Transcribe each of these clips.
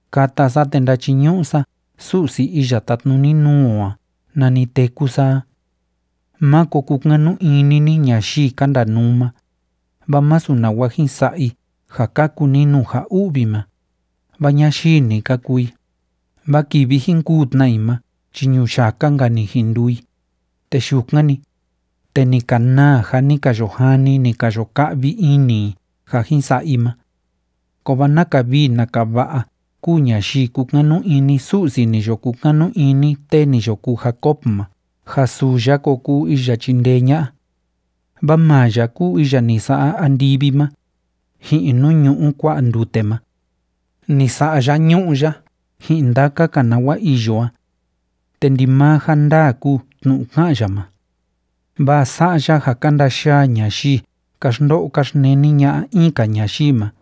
Kata sa te ndachiñu'u sa Su'si iya tátnuni nuu o a nani téku sa a. Máko kukanu ini ni ñayii ka ndanuu ma, vaa masu nawa jin sa'a i ja kaku ni nuu ja u'vi ma, vaa ñayii‑ni ka kuu i. Vaa kivi jin kûu tna i ma chi ñuyaka‑nka‑ni jin nduu i, te yukan‑ni, te ni ka naa ja ni ka yo jani, ni ka yo ka'vi ini i ja jin sa'a i ma. ¡Kovaa naka vii naka va'a‑ka kúu ñayii kúkanu ini Su'si ni yo kukanu ini tee ni yo kuu Jacob ma ja suu ya ko kuu iya chindee ña'a! Vaa maa ya kúu iya ni sa'a andivi ma, ji'in nuu ñu'u kua'a ndute ma. Ni sa'a ya ñu'ú ya ji'in ndaka‑ka nawa iyo a. Te ndimaa ja ndaa kúu tnu'u ká'an ya ma. Vaa sa'a ya ja ka ndayaa ñayii ka xndo'o ka xneni ña'a in‑ka ñayii ma,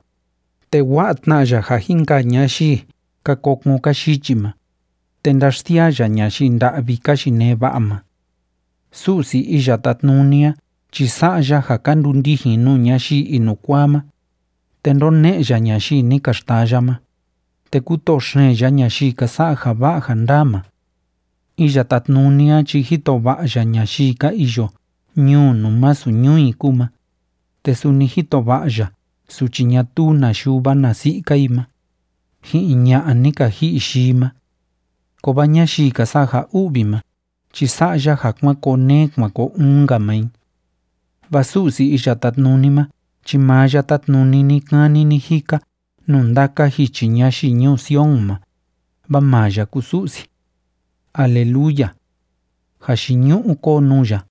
te wa'a tna ya ja jin kaa ñayii ka kokon ka yichi ma, te ndáxsiaa ya ñayii nda'vi ka yinee va'a ma. Su'si Iya Tátnuni a chi sa'a ya ja ka ndundijin nuu ñayii inukuaa ma, te ndóne'e ya ñayii ni ka xtaya ma, te kútoo xeen ya ñayii ka sa'a ja va'a ja ndaa ma. Iya Tátnuni a chi jito va'a ya ñayii ka iyo ñuu nuu masu ñuu i kúu ma, te suni jito va'a ya suchi ñatuu na yuva na si'i‑ka i ma, ji'in ña'a ni ka ji'i yii ma. Kovaa ñayii ka sa'a ja u'vi ma chi sa'a ya ja kuan koo neé kuan koo uun‑nka maa i. Vaa Su'si Iya Tátnuni ma chi maa ya tátnuni ni‑kani ni‑jika nuu ndaka jichi ñayii ñuu Sion ma, vaa maa ya kúu Su'si. ¡Aleluya! ¡Jayiñu'u kóo nuu ya!